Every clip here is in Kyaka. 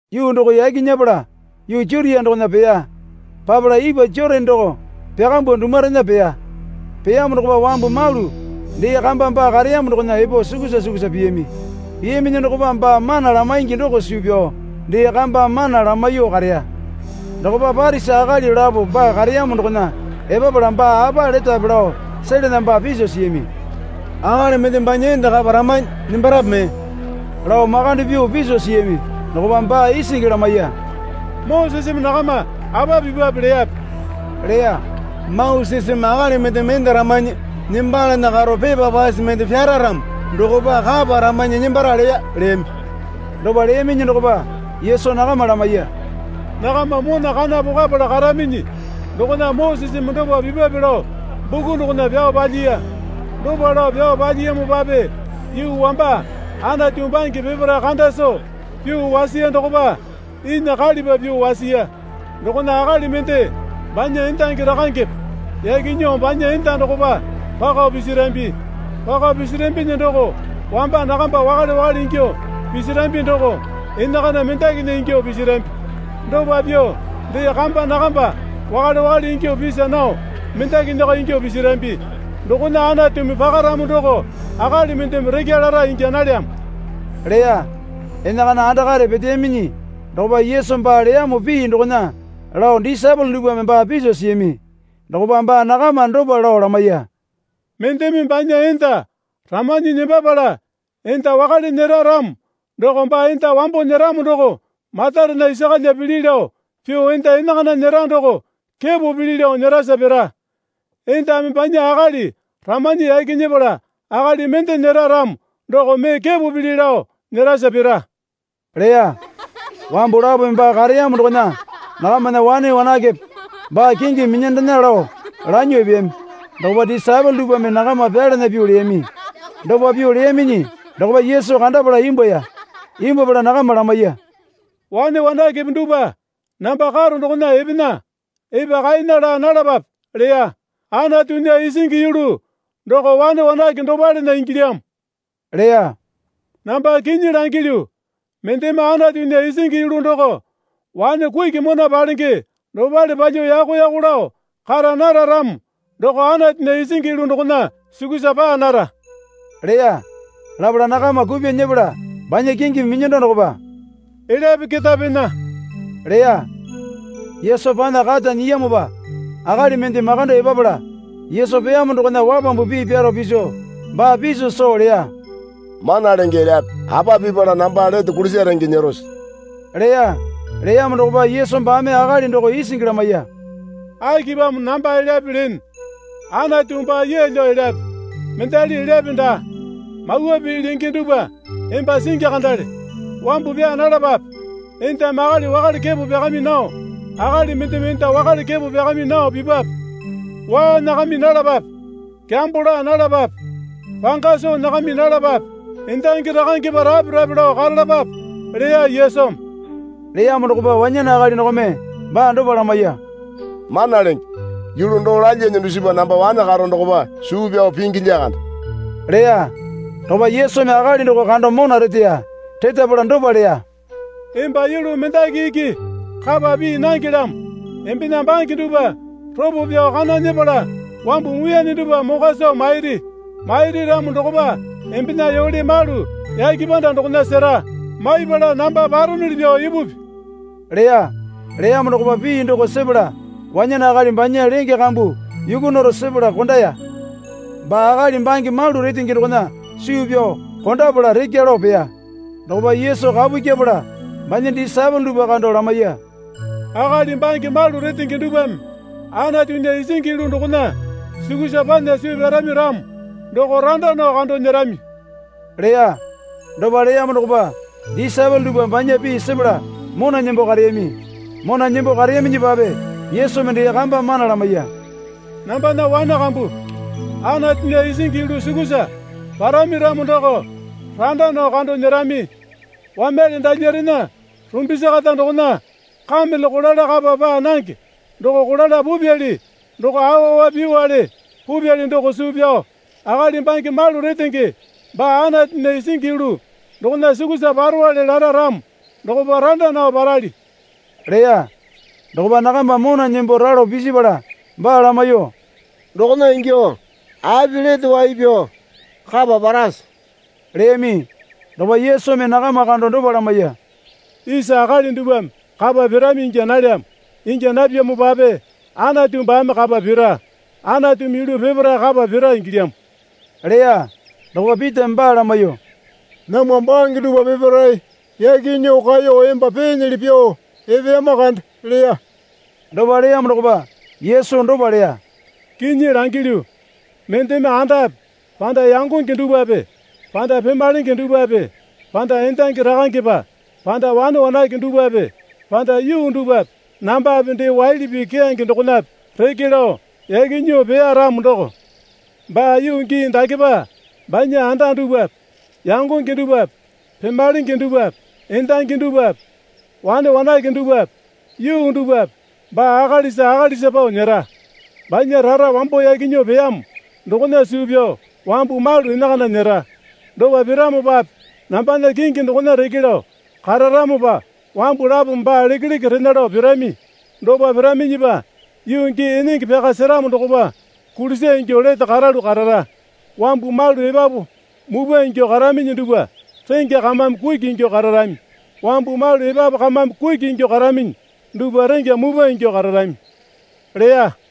Yuu doko yaki nyepala yuu Jutia dokona peya. Papala ipwa Jotane doko pyakambuo dumwarena peya. Peyamo dokopa wambu malu dee kamba baa kareyamo dokona epo sukusa sukusa piyami. Piyaminyi dokopa baa mana lamaingi doko suu pyao dee kamba mana lamaiyuo kareya. Dokopa Parisi akali lapo baa kareyamo dokona epapala baa apa letape lao selana baa piso siyami. Akali mendeme banya enda kapa ramanyi nembarape mee? lao makande pyuo piso siyami. Dokopa baa isingi lamaiya. Moseseme nakama apa pipwape leyape? leya. Moseseme akali mendeme enda ramanyi nembalana karo pepa pase mende pyara ramo dokopa kapa ramanyi nembara leya, leyami. Dopa leyaminyi dokopa Yesu nakama lamaiya. Nakama mona kana pokwapala karaminyi dokona Moseseme dopa pipwape lao buku dokona pyao palyiya. Dopa lao pyao palyiyamopape yuu wamba Anatu bange peparae kanda soo pyuo wasiya dokopa inya kalipa pyuo wasiya. Dokona akali mende banya endangi rakangepe yaki nyuo banya enda dokopa pako pisirambi. Pako pisirambinyi doko wamba nakamba wakale wakale ingyuo pisirambi doko enakana mendakinya ingyuo pisirambi. Dopa pyuo dee kamba nakamba wakale wakale ingyuo pisa nao mendakinyako ingyuo pisirambi. Dokona Anatumi pakaramo doko akali mendeme rakya lara ingya nalyamo, leya. Enakana andakare peteyaminyi dokopa Yesu baa leyamo pii dokona lao disaepole dupwame baa piso siyami. Dokopa baa nakama dopa lao lamaiya. Mendeme banya enda ramanyi nembapala enda wakale nyera ramo doko baa enda wambo nyeramo doko matarena isa kalya pili lao pyuo enda enakana nyera doko kepo pili lao nyerasa pira. Endame banya akali ramanyi yaki nyepala akali mende nyera ramo doko mee kepo pili lao nyerasa pira, leya. Wambu lapome baa kareyamo dokona nakamana wane wanakepe baa kingimi minyandena lao lanyuo epeyami. Dokopa disaepole dupwame nakama pyalana pyuo leyami. Dopa pyuo leyaminyi dokopa Yesu kandapala imbwuaya. Imbwuapala nakama lamaiya. Wane wanakepe dupwa namba karo dokona epena. Epa kaena laa nalapape, leya. Anatunya isingi yulu doko wane wanake dopalena ingilyamo, leya. Namba kinyi langilyu, mendeme Anatunya isingi yulu doko wane kuki mona palenge dopale palyuo yako yako lao kara nara ramo doko Anatunya isingi yulu dokona sukusa paa nara, leya. Lapala nakama kupyuo nyepala banya kingimi minyando dokopa, elyape keta pena, leya. Yesu panya kata nyiyamopa akali mende makando epapala. Yesu peyamo dokona wapambu pii pyaro piso baa piso soo leya. Mana Lenge elyape, apa pipala namba lete kulisa renge nyerose? leya. Leyamo dokopa Yesu baame akali doko isingi lamaiya. Akipamo namba elyape lene? Anatu baa yeelyo elyape, mendali elyape daa. Mawa pii lenge dupwa emba singi kandale. Wambu pyaa nalapape. Endame akali wakale kepo pyakami nao akali mendeme enda wakale kepo pyakami nao pipwape. Waa nyakami nalapape. Kyambo laa nalapape. Panga soo nyakami nalapape. Endangi rakangepa rape rape lao karalapape, leya Yesumi. Leyamo dokopa wanyane akali dokome baa dopa lamaiya. Mana Lenge, yulu doo lalyane dusipa namba wane karo dokopa suu pyao pingi lyakande leya. Dokopa Yesumi akali doko kando mona reteya. Retapala dopa leya. Emba yulu mendaki iki kapa pii nangelyamo. Embena bange dupwa ropo pyao kana nyepala wambu muiyane dupwa mokwa soo mairi. Mairi ramo dokopa embena yole malu yake panda dokona sera. Maipala namba paronuli pyuo ipupi, leya. Leyamo dokopa pii doko sepala wanyane akali banya lenge kambu yukwa naro sepala kondaya. Baa akali bange malu retenge dokona suu pyao kondapala rekya lao peya. Dokopa Yesu kapu kyepala banya disaepole dupwa kando lamaiya. Akali bange malu retenge dupwame Anatunya isingi yulu dokona sukusa panya suu pyarami ramo doko randa nao kando nyerami, leya. Dopa leyamo dokopa disaepole dupwa banya pii sepala mona nembo kareyami. Mona nembo kareyaminyipape Yesumi dee kamba mana lamaiya. Nambana wane kambu, Anatunya isingi yulu sukusa parami ramo doko randa nao kando nyerami. Wamyale dalyarena rumbisi kata dokona kamele kolala kapa paa nange doko kolala pupyali doko awa awa pyuowale pupyali doko suu pyao akali bange malu retenge baa Anatunya isingi yulu dokona sukusa parowale lara ramo dokopa randa nao parali, leya. Dokopa nakama mona nembo ralo pisipala baa lamaiyuo, Dokona ingyuo api lete wai pyao kapa parase? leyami. Dokopa Yesumi nakama kando dopa lamaiya. Isa akali dupwame kapa pirami ingya nalyamo. Ingya napyamopape Anatu baame kapa pira. Anatumi yulu peparae kapa pira ingilyamo, leya. Dokopa Pitame baa lamaiyuo, Namwa bange dupwa peparae yaki nyuo kaeyo emba peenyili pyuo epeyama kande, leya. Dopa leyamo dokopa Yesu dopa leya. Kinyi langilyu, mendeme andape panda yangonge dupwape panda pemalenge dupwape panda endangi rakangepa panda wane wanake dupwape panda yuu dupwape nambape dee waili pii keyange dokonape reke lao yaki nyuo peya ramo doko baa yuu gii dakepa banya anda dupwape yangonge dupwape pemalenge dupwape endangi dupwape wane wanake dupwape yuu dupwape baa akalisa akalisa pao nyera, banya rara wambo yaki nyuo peyamo dokona suu pyao wambu malu enakana nyera. Dopa piramopape nambana kingi dokona reke lao kararamopa wambu lapome baa lekeleke rena lao pirami. Dopa piraminyipa yuu gii enenge pyaka seramo dokopa kulisa ingyuo lete karalu karara. Wambu malu epapu mupwa ingyuo karaminyi dupwa rengya kamame kuki ingyuo kararami. Wambu malu epapu kamame kuki ingyuo karaminyi dupwa rengya mupwa ingyuo kararami, leya.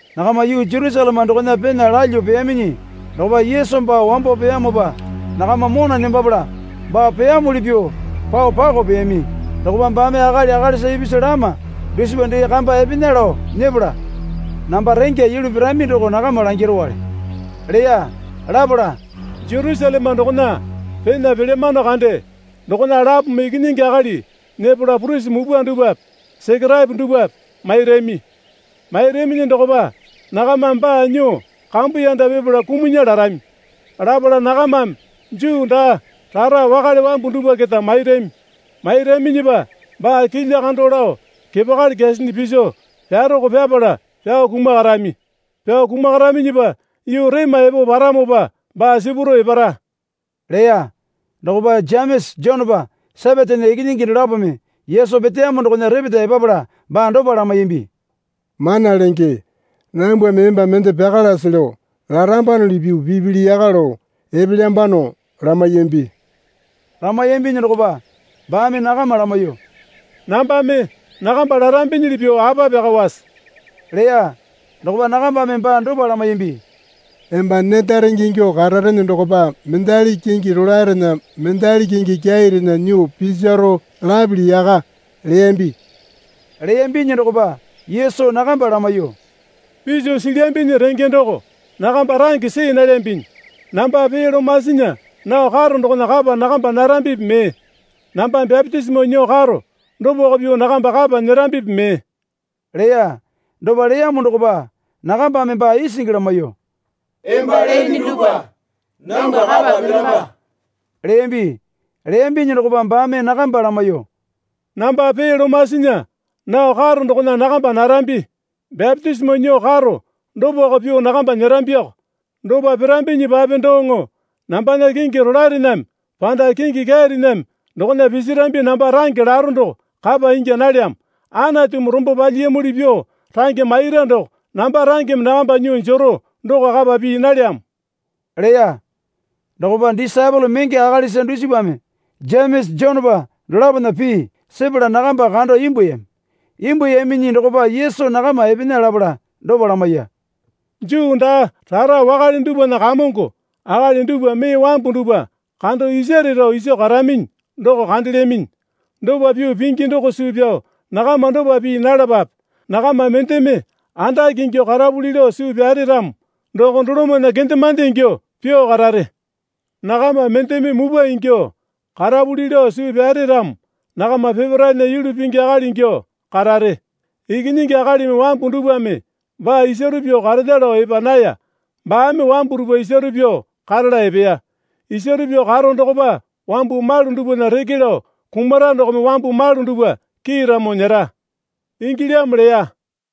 Nakama yuu Jerusaleme dokona pena lalyuo peyaminyi dokopa Yesu baa wambo peyamopa nakama mona nembapala baa peyamuli pyuo pao pakao peyami. Dokopa baame akali akalisa ipisu lama dusipa dee kamba epena lao nyepala, Namba rengya yulu pirami doko nakama langirowale, leya. Lapala, Jerusaleme dokona pena palyamano kande. Dokona lapome Ikinyingi Akali nyepala purisi mupwa dupwape Sekeraepo dupwape mairami. Mairaminyi dokopa nakamame baa nyuo kambuyanda pipala kumunya larami. Lapala nakamame Juu daa rara wakale wambu dupwa keta mairami. Mairaminyipa baa kilya kando lao kepakali kyasinyi piso pyaroko pyapala pyao kumakarami. Pyao kumakaraminyipa yuu rema epo paramopa baa sipuro epara, leya. Dokopa Jemesa Jonepa Sepetena ikinyingi dolapome Yesu peteyamo dokona repeta epapala baa dopa lamaiyambi. Mana Lenge, nambwame emba mende pyakalase lao larambanuli pyuo pipili yaka lao epelyambano, lamaiyambi. Lamaiyambinyi dokopa baame nakama lamaiyuo, Nambame nakamba larambinyili pyuo apa pyakawase? leya. Dokopa nakambame baa dopa lamaiyambi. Emba neta renge ingyuo kararene dokopa mendali kingi rolaerena mendali kingi kyairena nyuo pisaro lapili yaka, leyambi. Leyambinyi dokopa Yesu nakamba lamaiyuo, Piso silyambinyi renge doko nakamba range see nalyambinyi. Namba pee lomasinya nao karo dokona kapa nakamba narambipi mee? Namba bapitisimo nyuo karo dopako pyuo nakamba kapa nyerambipi mee? leya. Dopa leyamo dokopa nakambame baa isingi lamaiyuo, Emba lene dupwa nambwa kapa piramba, leyambi. Leyambinyi dokopa baame namkamba lamaiyuo, Namba pee lomasinya nao karo dokona nakamba narambi. Bapitisimo nyuo karo dopako pyuo nakamba nyerambiko. Dopa pirambinyipape doŋo nambana kingi rolaerename, panda kingi kyairename dokona pisirambi namba range laro doko kapa ingya nalyamo. Anatumi rombo palyiyamuli pyuo range maira doko namba rangeme nakamba nyuo jero doko kapa pii nalyamo, leya. Dokopa disaepole menge akalisa dusipame Jemesa Jonepa dolapona pii sepala nakamba kando imbwuayami. Imbwuayaminyi dokopa Yesu nakama epena lapala dopa lamaiya. Juu daa rara wakale dupwana kamongo akali dupwa mee wambu dupwa kando isare rao iso karaminyi doko kandelyaminyi. Dopa pyuo pingi doko suu pyao nakama dopa pii nalapape. Nakama mendeme andake ingyuo karapuli lao suu pyare ramo doko dolomana kendemande ingyuo pyuo karare. Nakama mendeme mupwa ingyuo karapuli lao suu pyare ramo nakama peparaena yulu pingi akali ingyuo karare. Ikinyingi Akalimi wambu dupwame baa isaro pyuo karena lao epa naya. Baame wambu dupwa isaro pyuo karala epeya. Isaro pyuo karo dokopa wambu malu dupwana reke lao kumara dokome wambu malu dupwa kiiramo nyera, ingilyamo leya.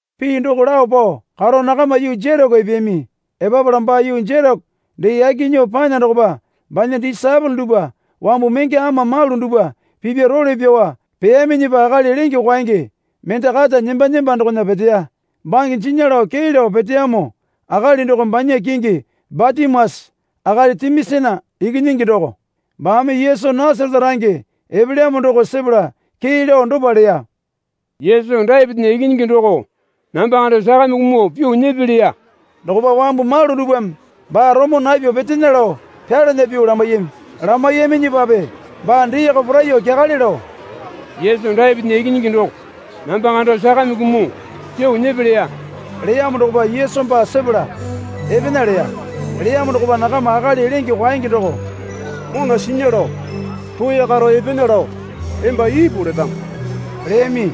Pii doko lao pao karo nakama yuu Jereko epeyami. Epapala baa yuu Jereko dee yaki nyuo panya dokopa banya disaepole dupwa wambu menge ama malu dupwa pipya role pyao peyaminyipa akali lenge kwaenge mende kata nemba nemba dokona peteya. Bange jinya lao kee lao peteyamo akali doko banya kingi Batimiasa akali Timiasana ikinyingi doko. Baame Yesu Nasarete range epelyamo doko sepala kee lao dopa leya. Yesu Dapitinya ikinyingi doko, namba kando sakame kumuo pyuo nyepe, leya. Dokopa wambu malu dupwame baa romo napyuo petena lao pyalana pyuo lamaiyami. Lamaiyaminyipape baa deeko poraiyuo kyakale lao, Yesu Dapitinya ikinyingi doko, namba kando sakame kumuo pyuo nyepe, leya. Leyamo dokopa Yesu baa sepala epena, leya. Leyamo dokopa nakama akali lenge kwaenge doko, Mona sinya lao roya karo epena lao emba ipu letamo, leyami.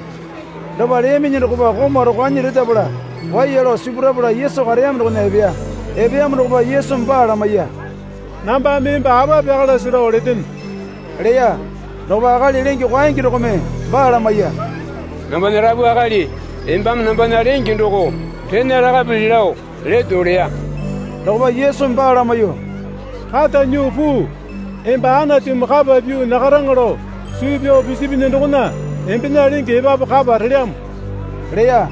Dopa leyaminyi dokopa komau rokwanyi retapala waiya lao sipurapala Yesu kareyamo dokona epeya. Epeyamo dokopa Yesumi baa lamaiya. Nambame emba apa pyakalase lao letene, leya. Dokopa akali lenge kwaenge dokome baa lamaiya. Nambana Rapu Akali embame nambana lenge doko rena lakapili lao leto, leya. Dokopa Yesumi baa lamaiyuo, Kata nyuo puu. Emba Anatumi kapa pyuo nyakaraŋa lao suu pyao pisipinyi dokona embena lenge epapu kapa relyamo, leya.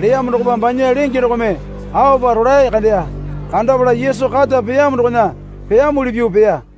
Leyamo dokopa banya lenge dokome aopa rolae kandeya. Kandapala Yesu kata peyamo dokona peyamuli pyuo peya.